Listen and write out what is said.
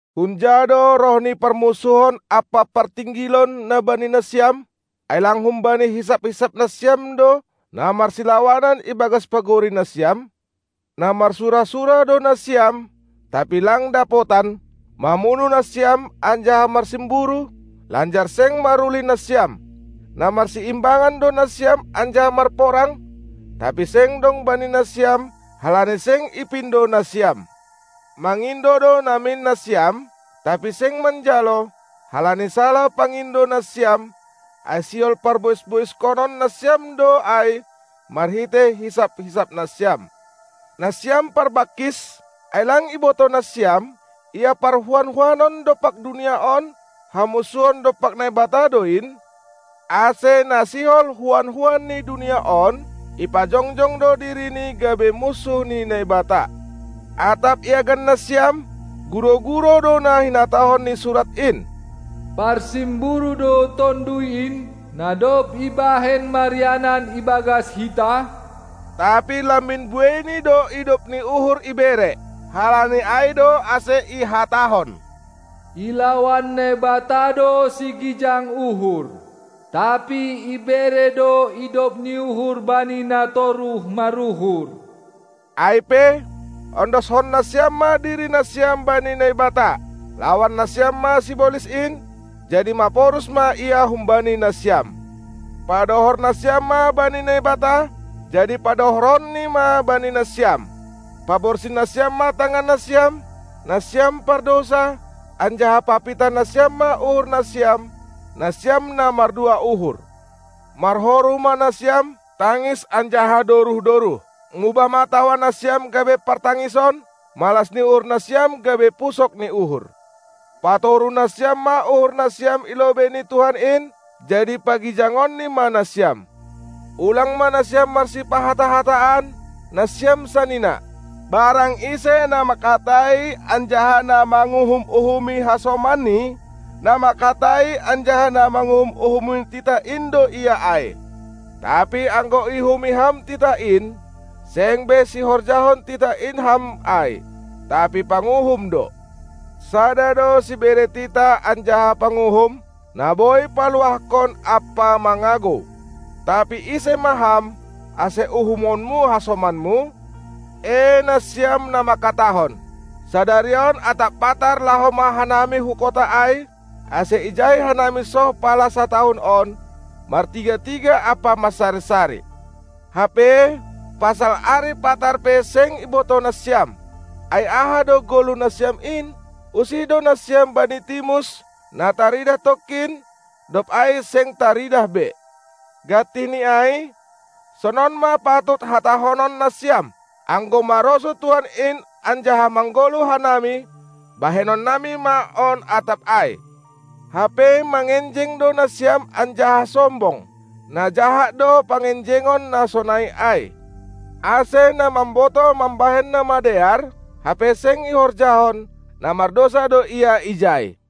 Hunja do roh ni parmunsuhon ampa partinggilon, na bani nasiam? Ai lang humbani hisap-hisap nasiam do, na marsilawanan ibagas pagori nasiam? Na marsura-sura do nasiam, tapi lang dapotan; mamunuh nasiam anjaha marsimburu, lanjar seng marulih nasiam. Na marsiimbangan do nasiam anjaha marporang, tapi seng dong bani nasiam, halani seng ipindo nasiam. Mangindo do namin nasiam, tapi seng manjalo, halani salah pangindo nasiam, ai sihol parbois-boiskonon nasiam do ai marhitei hisap-hisap nasiam. Nasiam parbangkis, ai lang ibotoh nasiam, ia parhuan-huanon dompak dunia on hamunsuhon dompak Naibata do in? Ase, na sihol huan-huan ni dunia on, ipajongjong do dirini gabe munsuh ni Naibata. Atap iagan nasiam, gurou-gurou do na hinatahon ni Surat in: Parsimburu do Tonduy in, na dob ibahen marianan ibagas hita? Tapi lambin bueini do idop ni uhur ibere. Halani ai do ase ihatahon: Ilawan Naibata do sigijang uhur, tapi ibere do idop ni uhur bani na toruh maruhur. Ai pe, ondoskon nasiam ma diri nasiam bani Naibata; lawan nasiam ma sibolis in, jadi maporus ma ia humbani nasiam. Padohor nasiam ma bani Naibata, jadi padohoronNi ma bani nasiam. Paborsih nasiam ma tangan nasiam, nasiam pardousa, anjaha papitah nasiam ma uhur nasiam, nasiam na mardua uhur! Marhoru ma nasiam, tangis anjaha doruh-doruh. Mubah ma tawa nasiam gabe partangison, malas ni uhur nasiam gabe pusok ni uhur! Patoruh nasiam ma uhur nasiam i lobei ni Tuhan in, jadi pagijangonni ma nasiam. Ulang ma nasiam marsipahata-hataan, nasiam sanina! Barang ise na manghatai anjaha na manguhum-uhumi hasomanni, na manghatai anjaha na manguhum-uhumi titah in do ia ai. Tapi anggo iuhumi ham titah in, seng be sihorjahon titah in ham ai, tapi panguhum do. Sada do Sibere titah anjaha Panguhum, na boi paluahkon ampa mangagou. Tapi, ise ma ham, ase uhumonmu hasomanmu? Ee nasiam, na mangkatahon: Sadari on atap patar laho ma hanami hu kota ai, ase ijai hanami soh pala satahun on, martiga-tiga ampa mansari-sari. Hape pasal ari patar pe seng ibotoh nasiam. Ai aha do goluh nasiam in? Usih do nasiam bani timus, na taridah tongkin, dob ai seng taridah be. Gantih ni ai, sonon ma patut hatahonon nasiam: Anggo marosuh Tuhan in anjaha manggoluh hanami, bahenonnami ma on atap ai. Hape mangenjeng do nasiam anjaha sombong; na jahat do pangenjengon na sonai ai. Ase, na mambotoh mambahen na madear, hape seng ihorjahon, na mardousa do ia ijai.